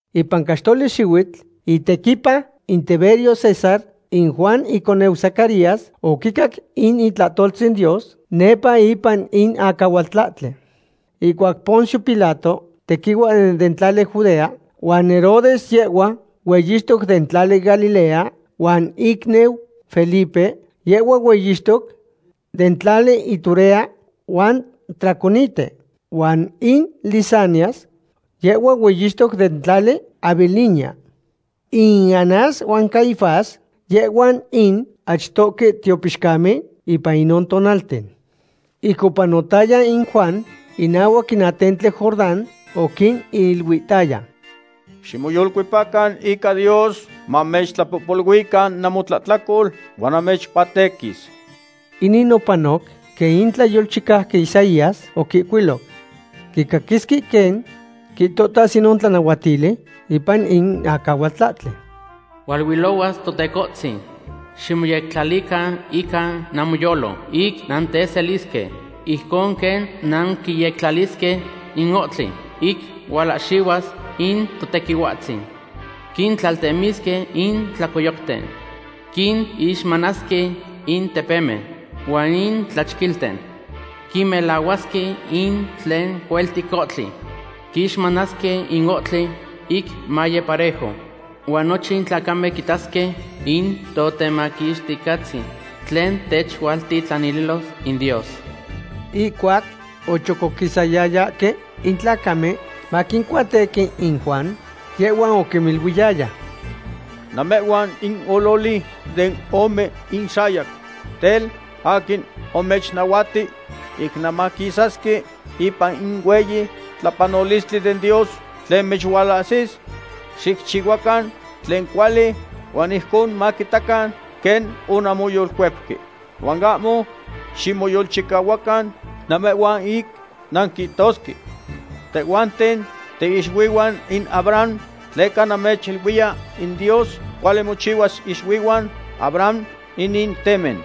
Ipan caxtoli xihuitl itequipa in Tiberio César, in Juan iconeu Zacarías oquicac in itlahtoltzin Dios nepa ipan in acahualtlahtli. Ihcuac Poncio Pilato tequihua den tlali Judea, huan Herodes yehhua hueyixtoc den tlali Galilea, huan icniu Felipe yehhua hueyixtoc den tlali Iturea huan Traconite, huan in Lisanias yehhua hueyixtoc den tlali Abilinia. In Anás huan Caifás, yehhuan in achtohque tiopixcamen ipan inon tonalten. Ic opanotaya in Juan inahuac in atentli Jordán, oquiniluihtaya: ―Ximoyolcuepacan ica Dios mamechtlapohpoluican namotlahtlacol huan namechcuatequis. Inin opanoc quen in tlayolchicauqui Isaías oquihcuilo: Quicaquisque quen quihtohtas inon tlanahuatili ipan in acahualtlahtli: “Hualuilohuas Totecohtzin. Ximoyectlalican ica namoyolo ic nanteselisque, ijcon quen nanquiyectlalisque in ohtli ic hualahxihuas in Totequihuatzin. Quitlaltemisque in tlacoyocten. Quinixmanasque in tepemen huan in tlachquilten. Quimelahuasque in tlen cueltic ohtli. Quixmanasque in ohtli ic maye parejo. Huan nochin tlacamen quitasque in Totemaquixticahtzin tlen techualtitlanililos in Dios.” Ihcuac ochocoquisayayahque in tlacamen, maquincuatequi in Juan, yehhuan oquiniluiyaya: ―¡Namehhuan in ololi den ome inxayac! Tel, ¿aquin omechnahuati ic nanmaquisasque ipan in hueyi tlapanolistli den Dios tlen mechualahsis? Xicchihuacan tlen cuali huan ijcon maquitacan quen onanmoyolcuepque. Huan ahmo ximoyolchicahuacan namehhuan ic nanquihtosque: “Tehhuanten tiixuihuan in Abraham”, tleca namechiluiya in Dios cuali mochihuas ixuihuan Abraham inin temen.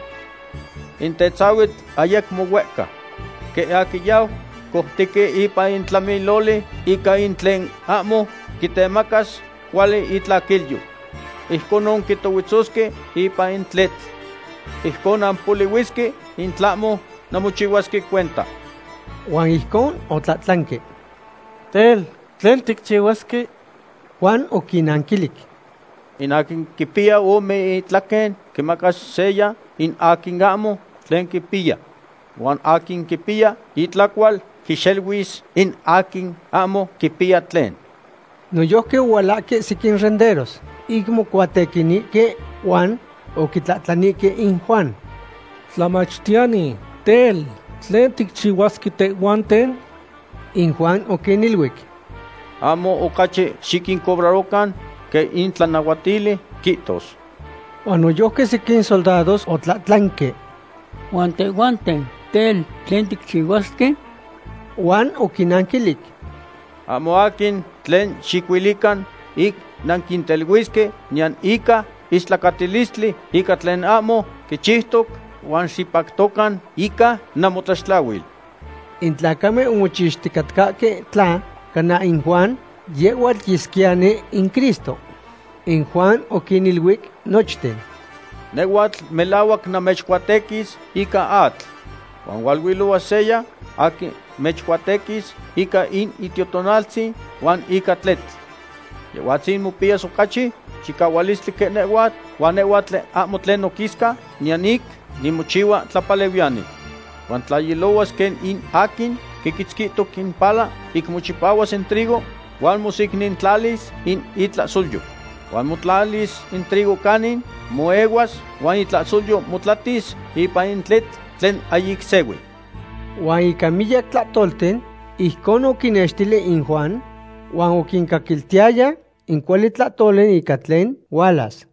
In tetzahuitl ayacmo huehca. Quen aquin yau coutequi ipan in tlamiloli ica in tlen ahmo quitemacas cuali itlaquilyo. Ijconon quitohuetzosque ipan in tletl. Ijcon nampolihuisque in tlahmo nanmochihuasque cuenta. Huan ijcon otlahtlanque: ―Tel, ¿tlen ticchihuasque? Juan oquinnanquilic: ―In aquin quipiya ome itlaquen, quimacas seya in aquin ahmo tlen quipiya. Huan aquin quipiya itlacual quixeluis in aquin ahmo quipiya tlen. Noyojqui ohualahque sequin renderos ic mocuatequinihque huan oquitlahtlanihque in Juan: ―Tlamachtiyani, tel, ¿tlen ticchihuasque tehhuanten? In Juan oquiniluic: ―Ahmo ocachi xiquincobrarocan quen in tlanahuatili quihtos. Huan noyojqui sequin soldados otlahtlanque: ―Huan tehhuanten, tel, ¿tlen ticchihuasque? Huan oquinnanquilic: ―Ahmo aquin tlen xicuilican ic nanquinteluisque niyan ica istlacatilistli ica tlen ahmo quichiutoc, huan xipactocan ica namotlaxtlahuil. In tlacamen omochixticatcahque tla cana in Juan yehhuatl yesquiyani in Cristo. In Juan oquiniluic nochten: ―Nehhuatl melahuac namechcuatequis ica atl. Huan hualuilohuas seya aquin mechcuatequis ica in Itiotonaltzin huan ica tletl. Yehhuatzin mopiyas ocachi chicahualistli quen nehhuatl, huan nehhuatl ahmo tlen noquisca niyan ic nimochihua tlapalehuiyani. Huan tla ilohuas quen in aquin quiquitzquihtoc in pala ic mochipahuas in trigo huan mosecnintlalis in itlahsolyo. Huan motlalis in trigo canin moehuas huan in itlahsolyo motlatis ipan in tletl tlen ahyic sehui. Huan ica miyac tlahtolten ijcon oquinnextili in Juan, huan oquincaquiltiyaya in cuali tlahtoli ica tlen hualas.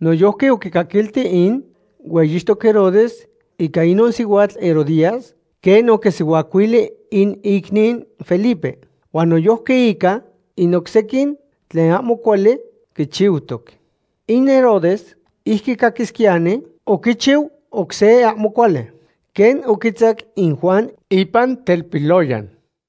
Noyojqui oquicaquilti in hueyixtoc Herodes ica inon sihuatl Herodías quen oquisihuacuili in icniu Felipe. Huan noyojqui ica in oc sequin tlen ahmo cuali quichiutoc. In Herodes, ic quicaquisquiyani, oquichiu oc se ahmo cuali, quen oquitzacu in Juan ipan telpiloyan.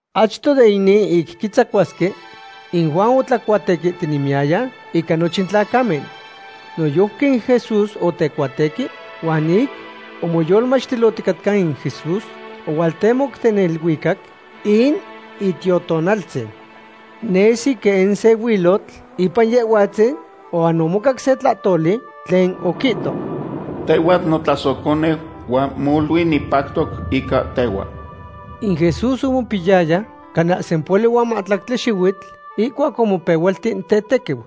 Achto de inin ic quitzacuasque, in Juan otlacuatequihtinemiyaya ica nochin tlacamen. Noyojqui in Jesús otecuatequi, huan ic omoyolmachtilohticatca in Jesús, ohualtemoc den neluicac in Itiotonaltzin. Nesi quen se huilotl ipan Yehhuatzin huan omocac se tlahtoli tlen oquihto: ―Tehhuatl notlasohconeu huan molui nipactoc ica tehhua. In Jesús omopiyaya cana sempohuali huan mahtlactli xihuitl ihcuac omopehualti tetequiu.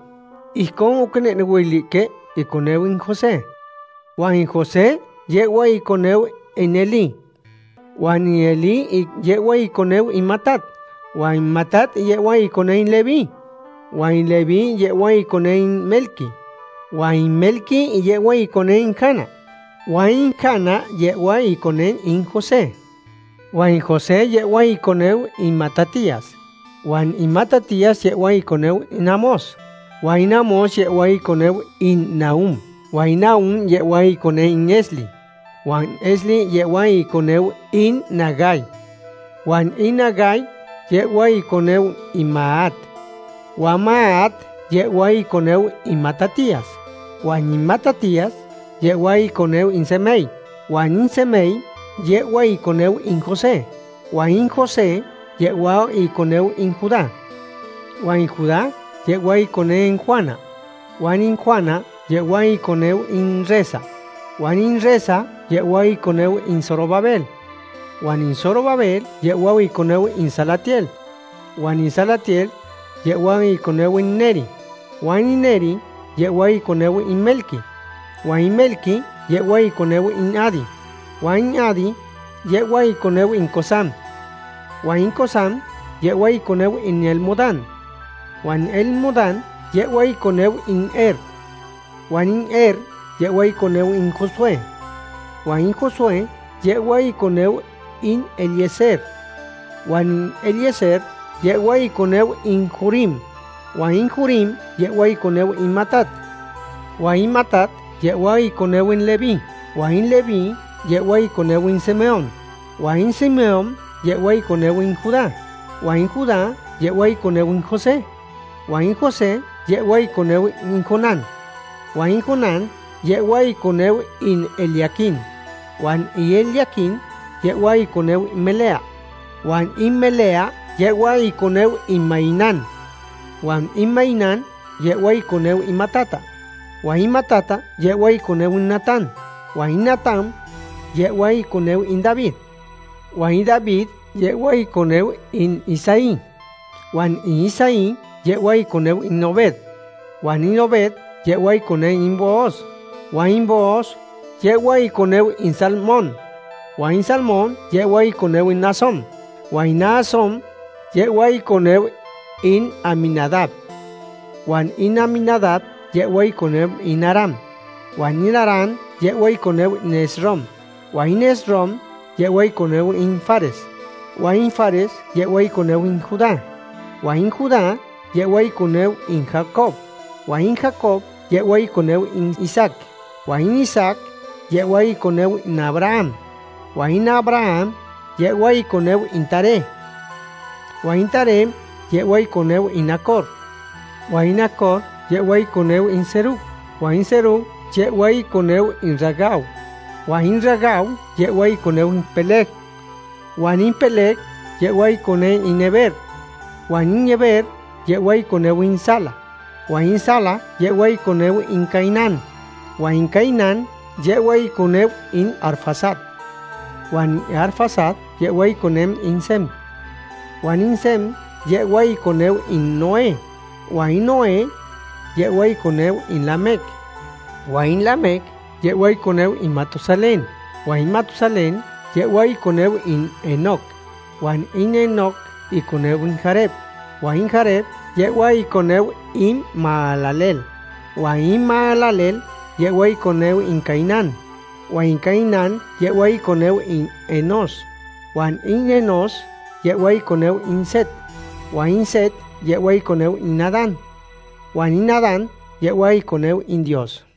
Ijcon oquinehnehuilihque iconeu in José. Huan in José yehhua iconeu in Elí. Huan in Elí yehhua iconeu in Matat, huan in Matat yehhua iconeu in Leví. Huan in Leví yehhua iconeu in Melqui. Huan in Melqui yehhua iconeu in Jana. Huan in Jana yehhua iconeu in José. Huan in José yehhua iconeu in Matatías. Huan in Matatías yehhua iconeu in Amós. Huan in Amós yehhua iconeu in Nahum. Huan in Nahum yehhua in iconeu in Esli. Huan in Esli yehhua iconeu in Nagai. Huan in Nagai yehhua iconeu in Maat. Huan Maat yehhua iconeu in Matatías. Huan in Matatías yehhua iconeu in Semei. Huan in Semei yehhua iconeu in José. Huan in José yehhua iconeu in Judá. Huan in Judá yehhua iconeu in Joana. Huan in Joana yehhua iconeu in Resa. Huan in Resa yehhua iconeu in Zorobabel. Huan in Zorobabel yehhua iconeu in Salatiel. Huan in Salatiel yehhua iconeu in Neri. Huan in Neri yehhua iconeu in Melqui. Huan in Melqui yehhua iconeu in Adi. Huan in Adi yehhua iconeu in Cosam. Huan in Cosam yehhua iconeu in Elmodam. Huan in Elmodam yehhua iconeu in Er. Huan in Er yehhua iconeu in Josué. Huan in Josué yehhua iconeu in Eliezer. Huan in Eliezer yehhua iconeu in Jorim. Huan in Jorim yehhua iconeu in Matat. Huan in Matat yehhua iconeu in Leví. Huan in Leví yehhua iconeu in Simeón. Huan in Simeón yehhua iconeu in Judá. Huan in Judá yehhua iconeu in José. Huan in José yehhua iconeu in Jonán. Huan in Jonán yehhua iconeu in Eliaquim. Huan in Eliaquim yehhua iconeu in Melea. Huan in Melea yehhua iconeu in Mainán. Huan in Mainán yehhua iconeu in Matata. Huan in Matata yehhua iconeu in Natán. Huan in Natán yehhua iconeu in David. Huan in David yehhua iconeu in Isaí. Huan in Isaí yehhua iconeu in Obed. Huan in Obed yehhua iconeu in Booz. Huan in Booz yehhua iconeu in Salmón. Huan in Salmón yehhua iconeu in Naasón. Huan in Naasón yehhua iconeu in Aminadab. Huan in Aminadab yehhua iconeu in Aram. Huan in Aram yehhua iconeu in Esrom. Huan in Esrom yehhua iconeu in Fares. Huan in Fares yehhua iconeu in Judá. Huan in Judá yehhua iconeu in Jacob. Huan in Jacob yehhua iconeu in Isaac. Huan in Isaac yehhua iconeu in Abraham. Huan in Abraham yehhua iconeu in Taré. Huan in Taré yehhua iconeu in Nacor. Huan in Nacor yehhua iconeu in Serug. Huan in Serug yehhua iconeu in Ragau. Huan in Ragau yehhua iconeu in Peleg. Huan in Peleg yehhua iconeu in Heber. Huan in Heber yehhua iconeu in Sala. Huan in Sala yehhua iconeu in Cainán. Huan in Cainán yehhua iconeu in Arfaxad. Huan in Arfaxad yehhua iconeu in Sem. Huan in Sem yehhua iconeu in Noé. Huan in Noé yehhua iconeu in Lamec. Huan in Lamec yehhua iconeu in Matusalén. Huan in Matusalén yehhua iconeu in Enoc. Huan in Enoc iconeu in Jared. Huan in Jared yehhua iconeu in Mahalaleel. Huan in Mahalaleel yehhua iconeu in Cainán. Huan in Cainán yehhua iconeu in Enós. Huan in Enós yehhua iconeu in Set. Huan in Set yehhua iconeu in Adán. Huan in Adán yehhua iconeu in Dios.